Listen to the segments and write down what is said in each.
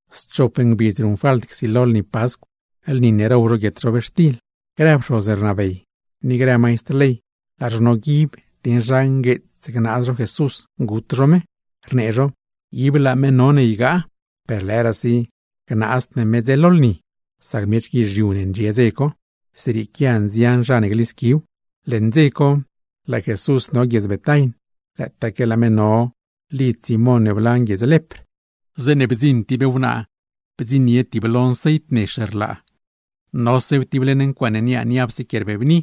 Schop ngbidz ruṉfalt csilo lni Pascw, lni ne row zho guietxtil ne riotsd ncobi; grë pxoz nroob ni grë maistr ley, laa zho noguib dieṉ zha ngueetsse gnaaz zho Jesús gut zho me, rnee zho: ―Laa me no ygaa, per lëëraasi gnaazd ne me mer dze lni, sac miech guizhiu ne ndxie lo lni dze co; zrieequia nzian zha ne glisquiw. Leṉ dze co, laa Jesús no guiedz Betain. Lëëtaaque laa me no mezh lidz Simón ne blan guiedz lepr, zeeṉe bdziṉ tib wnaa bdziṉnie tiblo nceit nex, nosew tib leṉ ncuaaṉ win niaa niapse quie rbebni,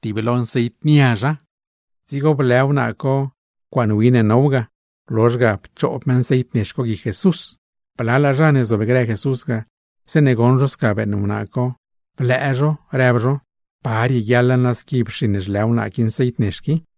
tiblo nceit niazha. Dzigo blë wnaa co ncuaaṉ win co, blozh ga pchoob me nceit co guic Jesús. Blalaa zha ne zobgrë Jesús ga, zeeṉe goṉ zho sca beeṉ wnaa co, blëë zho, rëb zho: ―¿Pa rieguiaḻa squi pxiṉ zhlë wnaa qui nceit qui?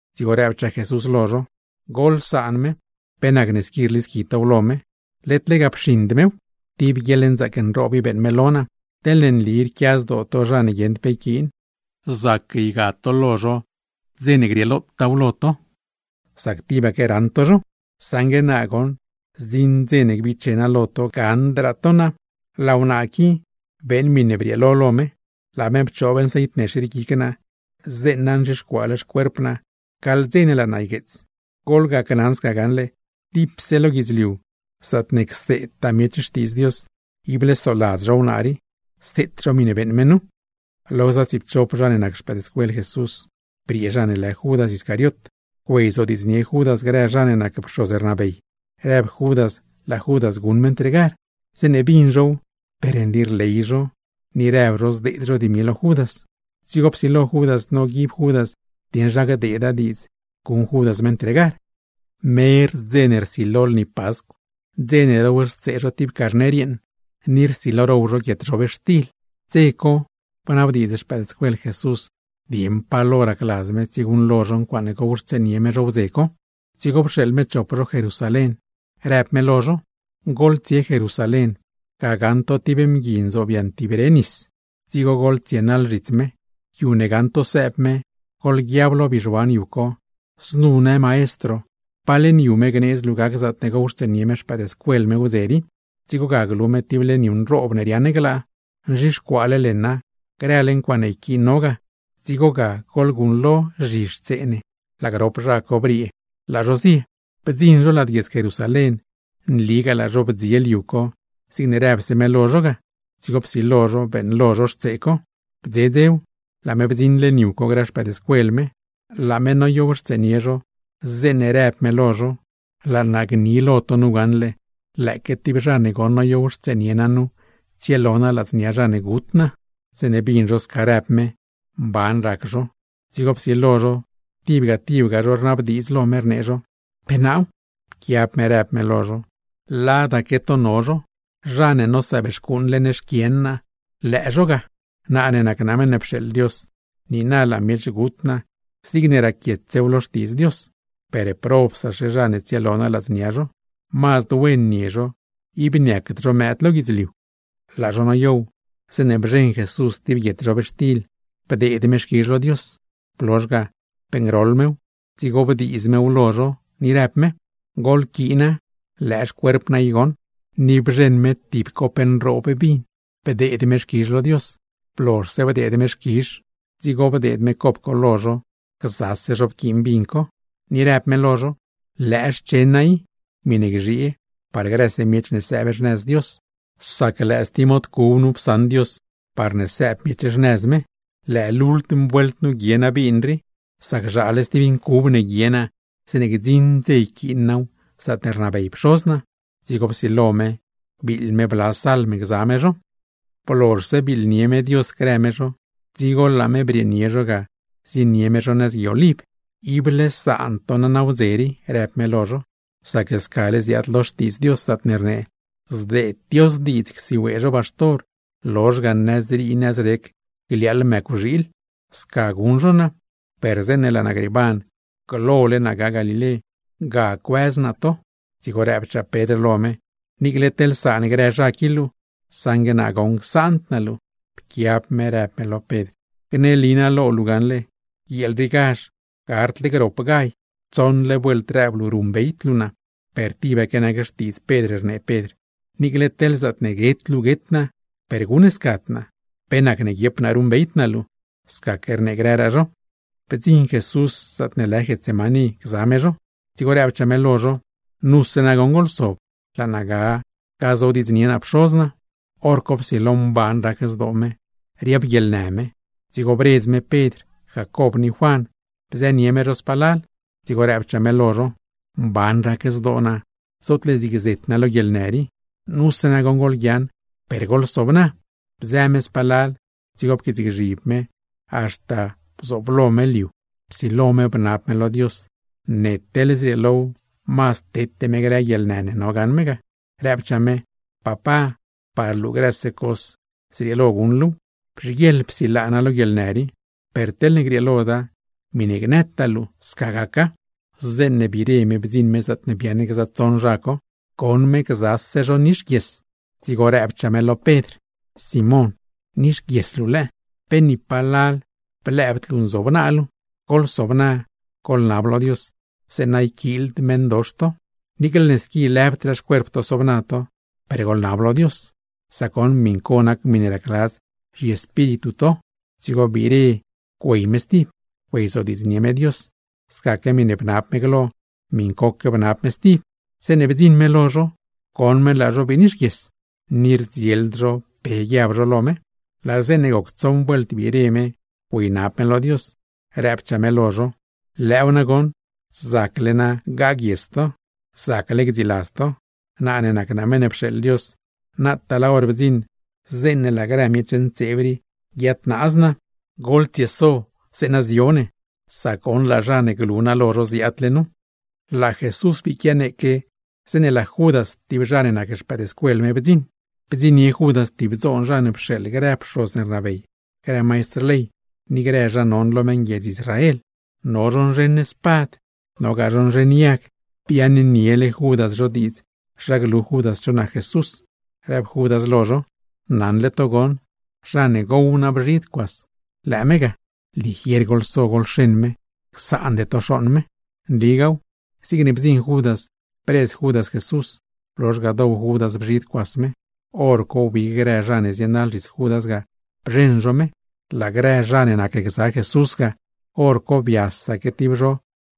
dzigo rëbchaa Jesús lo zho: ―Goḻsaan me. ¿Pe nacne rlisqui tow lo me? Led lega pxiṉd mew, tib guieḻnzaac nroob i beeṉ me lo naa. Teḻne nli rquia zdoo to zha ne guieṉd pe yquiin, zac ygad to lo zho stib dze, sac tibaque raṉ to zho; saṉgue naa zdziṉ dze ne gbiche naa lo to, gaṉdraa to naa. Laa wnaa qui beeṉ miṉe brieelo lo me, laa me pchoob nceit nex rii guic naa zeeṉa nzhixcuaale xcuerp naa gaḻ dze ne laa naa ygueets. Gneli naa lo to gaṉle, dipse lo guidzliu zaatne cseedtaa miech Xtiidz Dios, ible soladz zho wnaa rii, seet zho miṉe beeṉ me nu. Lo gza tsiipchop zha ne nac xpëëdscuel Jesús ga, briee zha ne lë Judas Iscariot güeyzodiidznie Judas grë zha ne nac pxoz nroob, rëb Judas laa Judas guṉ me ntregar. Zeeṉe bin zhow, per nli rley zho ni rëb zho zdeed zho dimi lo Judas. Dzigo psilo Judas noguib Judas dieṉ pa hor gdeeda diidz guṉ Judas me ntregar. Mer dze ne rsilo lni Pascw, dze ne rowxtsee zho tib carner, ni rsilo zho row zho guietxtil ne rquiad ncobi lad, dze co bnabdiidz xpëëdscuel Jesús dieṉ pa lo racladz me tsieguṉlo zho ncuaaṉe gowxtseenie me zho wdze co. Dzigo pxeeḻ me chop zho Jerusalén, rëb me lo zho: ―Goḻtsie Jerusalén. Ga gaṉ to tib mgui nzobyaṉ tib re nis, dzigo goḻtsienaḻ zhits me. Yu ne gaṉ to sëëb me, goḻguiab lo bizhuan yu co: “Znu në maestro: ¿Pa leṉ yu me gneedz luu gac zaatne gowxtseenie me xpëëdscuel me wdze rii?” Dzigo ga glu me tib leṉ yu nroob ne riaaṉ glaa, nzhixcuaale leṉa, grële ncuaaṉe yquiin no ga; dzigo ga goḻguṉlo zhixtsee ne. Laa grop zha co briee, laa zho zie. Bdziṉ zho lad guiedz Jerusalén, nligaa laa zho bdziel yu co zigne rëbse me lo zho ga, dzigo psilo zho beeṉlo zho xtsee co. Bdze dzew, laa me bdziṉ leṉ yu co grë xpëëdscuel me. Laa me no mezh noyownie me zho, zeeṉe rëb me lo zho: ―Laa naa gni lo to gaṉle, lëëque tib zha ne goṉ noyownie naa nu tsielo naa ladznia zha ne gut naa. Zeeṉe bin zho sca rëb me, mban rac zho, dzigo psilo zho tibga tibga zho rnabdiidz lo me, rnee zho: ―¿Pe naaw? Pquiab me rëb me lo zho: ―Ladaque to no zho, zha ne nosëëb xcuuṉ leṉ xquien naa, lëë zho ga. Naa ne nac naa Meṉ ne pxeeḻ Dios, niina laa miech gut naa zigne raquietsew lo Xtiidz Dios; per, ¡probsaxe zha ne tsielo naa ladznia zho! ¡Mazd wen nie zho, ib niacd zho miech lo guidzliu! Laa zho noyow zeeṉe bzheṉ Jesús tib guietxtil, bdeed me xquizh lo Dios, blozh ga beeṉgroḻ mew dzigo bdiiz mew lo zho, ni rëb me: ―Goḻquiina, lëë xcuerp naa i goṉ. Ni bzheṉ me tib cop nroob vin, bdeed me xquizh lo Dios, blozhse bdeed me xquizh, dzigo bdeed me cop co lo zho, grëse zho go vin co. Ni rëb me lo zho: ―Lëë xchen naa i, miṉe gzhiee par grëse miech ne sëëb xnëz Dios, sac lëë stib mod cub nu psaṉ Dios parne sëëb miech xnëz me. Lëë lultm vuelt nu guie naa vin rii, sac zhaale stib vin cub ne guie naa zeeṉe laa naa gdziṉ zaatne rnabey Pxoz naa. Dzigo psilo me biiḻ me bla salm gza me zho. Blozhse biiḻnie me Dios grë me zho, dzigo laa me brieenie zho ga zienie me zho nëz Gui Oliv. ―Ible saan to naa nawdze rii ―rëb me lo zho―, sac scale ziaad lo Xtiidz Dios zaatne rnee: “Zdeed Dios diidz csiwee zho baxtor, lozh ga nëzrii nëzrec gliaaḻ mëcwxiil.” Sca guṉ zho naa, per zeeṉe laa naa grieeban glole naa ga Galilé, ga cuëz naa to. Dzigo rëbchaa Pedr lo me: ―Niicle teḻne saan grë zha qui luu, saṉgue naa goṉ csaand naa luu. Pquiab me rëb me lo Pedr: ―Gneli naa lo luu gaṉle, guieel riigazh, gardle grop gall tsoṉle vuelt rëb luu ruṉbeyd luu naa. Per tibaque nac xtiidz Pedr, rnee Pedr lo me: ―Niicle teḻ zaatne guet luu guet naa, per guṉscad naa. ¿Pe nacne guiep naa ruṉbeyd naa luu? Scaque rnee grëraa zho. Bdziṉ Jesús zaatne lë Getsemaní gza me zho, dzigo rëbchaa me lo zho: ―Nuse nagoṉ goḻsob, laa naa ga gazodiidznie naa Pxoz naa. Horco psilo mban rac zdoo me, riabguieḻnë me, dzigo bredz me Pedr, Jacob ni Juan, bzënie me zho palal dzigo rëbchaa me lo zho: ―Mban rac zdoo naa, zootle zig zet naa lo guieḻnë rii. Nuse nagoṉ goḻguiaaṉ, per goḻsobna. Bzë me spalal, dzigo pquiitsgzhib me haxta bdziṉ lo me lo liu; psilo me bnab me lo Dios ne teḻne zrieelow mazd tete me grë guieḻnë ne no gaṉ me, rëbchaa me: ―¡Papá, par luu grëse cos zrieelo guṉ luuw! ¡Bzhiguieḻ psilaa naa lo guieḻnë rii! Per teḻne grieeloda, miṉe gnëtaa luu, sca gaca. Zeeṉe biire me bdziṉ me zaatne biaaṉ gza tsoṉ zha co, goṉ me gzase zho nixguies; dzigo rëbchaa me lo Pedr: ―Simón, ¿nixguies luu lëë? ¿Pe ni palal blëëbd luu nzobna luu? Goḻsobna, goḻnab lo Dios zeeṉa yquiild meṉdox to. Niicle ne squi lëbdraa xcuerp to sobna to, per goḻnab lo Dios, sac goṉ miṉ co nac miṉe racladz zhiespíritu to. Dzigo biire güey me stib, güeyzodiidznie me Dios; scaque miṉe bnab me glo miṉcoque bnab me stib. Zeeṉe bdziṉ me lo zho, goṉ me laa zho bii nixguies. Ni rdzield zho pe guiab zho lo me. Laa zeeṉe goc tsoṉ vuelt biire me güeynab me lo Dios, rëbchaa me lo zho: ―Lëëw nagoṉ, zacle na gaguies to, zacle gdziiladz to. Naa ne nac naa Meṉ ne pxeeḻ Dios, naataa laa hor bdziṉ zeeṉe laa grë miech ntseeb rii guiadnaaz naa. Goḻtsieso, zeeṉa zio ne; sac goṉ laa zha ne glu naa lo zho ziaadle nu. Laa Jesús bii quianeeque, zeeṉe laa Judas (tib zha ne nac xpëëdscuel me) bdziṉ, bdziṉnie Judas tib dzoon zha ne pxeeḻ grë pxoz ne rnabey, grë maistr ley ni grë zha non lo meṉguiedz Israel. No zho nzheṉ spad, nogaa zho nzheṉ yag. Biaaṉniele Judas zho diidz zha glu Judas cho nac Jesús, rëb Judas lo zho: ―Naṉle to goṉ, zha ne gow naa bzhid cuas, lëë me ga; ligier goḻso goḻxeṉ me, ib csaande to xooṉ me. Nligaaw, zigne bdziṉ Judas bredz Judas Jesús; blozh ga dow Judas bzhid cuas me. Horco wbig grë zha ne zienaḻ zhits Judas ga bzheṉ zho me. Lo grë zha ne nacgza Jesús ga, hor co biasaque tib zho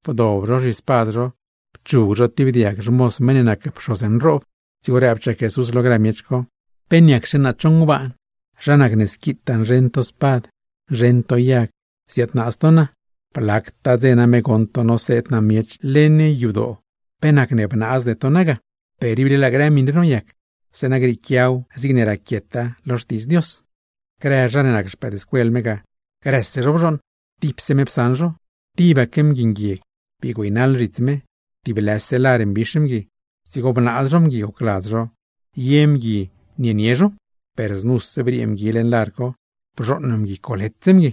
bdob zho zhispad zho pchug zho tib diag xmoz meṉ ne nac pxoz nroob. Dzigo rëbchaa Jesús lo grë miech co: ―¿Niacxe naa cho ngbaan, zha nac ne squitaa nzheṉ to spad, nzheṉ to yag ziadnaaz to naa? Blactaa dze name goṉ to noseed naa miech leṉ yadoo, ¿pe nacne bnaazde to naa ga? Per ible laa grë ncuaaṉ rii goṉ noyac zeeṉa gac grë miṉe raquiet lo Xtiidz Dios. Grë zha ne nac xpëëdscuel me ga, grëse zho bzhooṉ, tipse me psaṉ zho ga. Tibaque mgui nguieg bii güeynaḻ zhits me, tib lëse lar nquits mbix mgui; dzigo bnaaz zho mgui gocladz zho ye mgui nienie zho; per znuse briee mgui leṉ lar co, bzhooṉ mgui coletse mgui.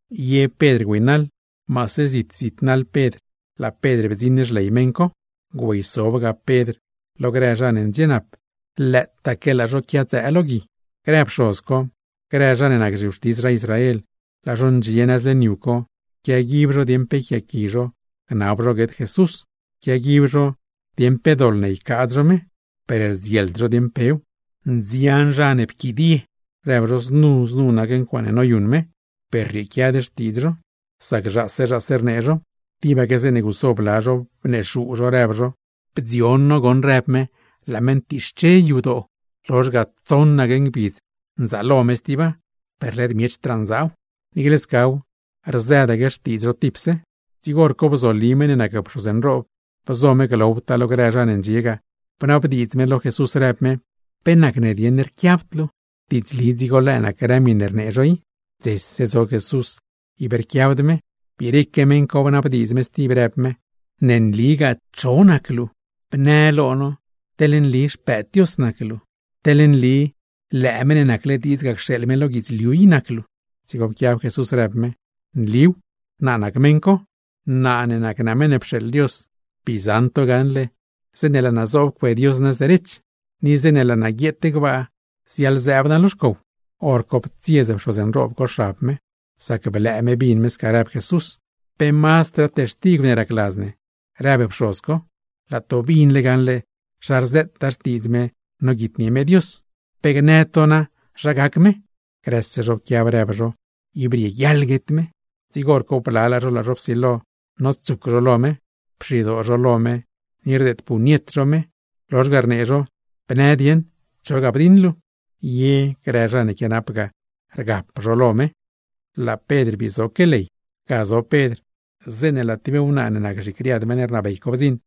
Ye Pedr, maase zit zit naḻ Pedr laa Pedr bdziṉ xley meṉ co. Bdziṉ Pedr, güeysobga Pedr lo grë zha ne ndxienap, lëëtaque laa zho quiadzëë lo gui. Grë pxoz co, grë zha ne nac zhiwxtis zha Israel, laa zho ndxie nëz leṉ yu co, quiaguib zho dieṉ pe yquiaaqui zho gnab zho guet Jesús, quiaguib zho dieṉ pe doḻ ne ycaadz zho me; per rdzield zho dieṉ pew. Nzian zha ne pquidie rëb zho znu znu nac ncuaaṉe noyuṉ me, per rrieequiad xtiidz zho; sac zhaase zhaase rnee zho. Tibaque zeeṉe guso blalaa zho, bnexuu zho rëb zho: ―Bdzion no goṉ rëb me laa me ctixche yadoo, lozh ga tsoṉaque ngbidz gzaalo me stiba; per led miechdraa nzaaw. Niicle scaw, rzëdaque xtiidz zho tipse. Dzigo hor co bzoli meṉ ne nac pxoz nroob, bzo me glowtaa lo grë miech co, bnabdiidz me lo Jesús rëb me: ―¿Pe nacne rquiabd luu? ¡Diidzli dzigo lëë nac grë miṉe rnee zho i! Dzese zo Jesús ib rquiabd me. Biireque meṉ co bnabdiidz me stib rëb me: ―¿Nligaa cho nac luu? Bnë teḻ nli Xpëëd Dios nac luu, Meṉ ne nacle diidz ga cxeeḻ me lo guidzliu. Dzigo pquiab Jesús rëb me: ―Nliw, naa nac meṉ co. Naa ne nac naa Meṉ ne pxeeḻ Dios, bii zaṉ to gaṉle zeeṉe laa naa zoob cue Dios nëz derech, ni zeeṉe laa naa guieet gbaa ziaḻzëëb naa lo xcow. Horco ptsiez pxoz nroob co xab me, sac blëë me bin me sca rëb Jesús. ―¿Pe mazdraa textigw ne racladz ne? ―rëb me―, laa to binle gaṉle zha rzëtaa xtiidz me noguitnie me Dios. ¿Pe gnë to na zha gac me? Grëse zho pquiab rëb zho, ib rieguiaḻa guet me. Dzigo hor co blalaa zho laa zho psilo notsuc lo me. Pxidoo zho lo me ni rdeed puñet zho me, lozh ga rnee zho: ―Bnë dieṉ, ¿cho ga bdiṉ luu? Ye grë zha ne quianap ga, rgap zho lo me. Laa Pedr bii zoque ley. Ga zo Pedr, zeeṉe laa tib wnaa ne nac zhicriad meṉ rnabey co bdziṉ;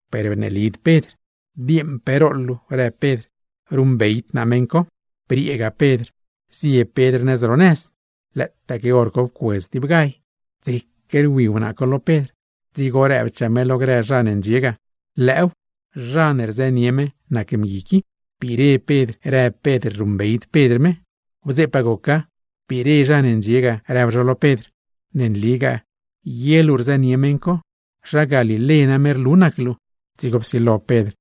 Per bneelid Pedr. ―Dieeṉ pe rooḻ luu ―rëb Pedr―. Ruṉbeyd naa meṉ co. Brieega Pedr zie Pedr nëz ro zawan, lëëtaque hor co pcuedz tib gall. Dzeque rwi wnaa co lo Pedr, dzigo rëbchaa me lo grë zha ne ndxie ga: ―¡Lëëw, zha ne rzënie me nac mgui qui! Biire Pedr rëb Pedr ruṉbeyd Pedr me. Wdzeepaa goca, biire zha ne ndxie ga rëb zho lo Pedr: ―Ne nligaa, ye luu rzënie meṉ co. ¡Zha Galilé name nac luu! Dzigo psilo Pedr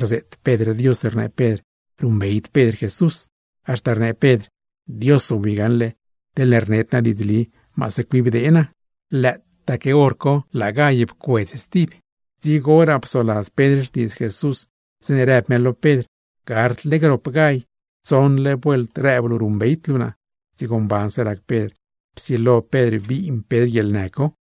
rzeet Pedr Dios rnee Pedr ruṉbeyd Pedr Jesús, haxta rnee Pedr: ―¡Dios zobwi gaṉle, teḻne rned naa diidzli, maase cuibdee naa! Lëëtaaque hor co laa gall pcuedz stib. Dzigoraa psoladz Pedr xtiidz Jesús zeeṉ rëb me lo Pedr: “Gardle grop gall, tsoṉle vuelt rëb luu ruṉbeyd luu naa.” Dzigo mbanse rac Pedr, psilo Pedr biin Pedr guieḻnë co.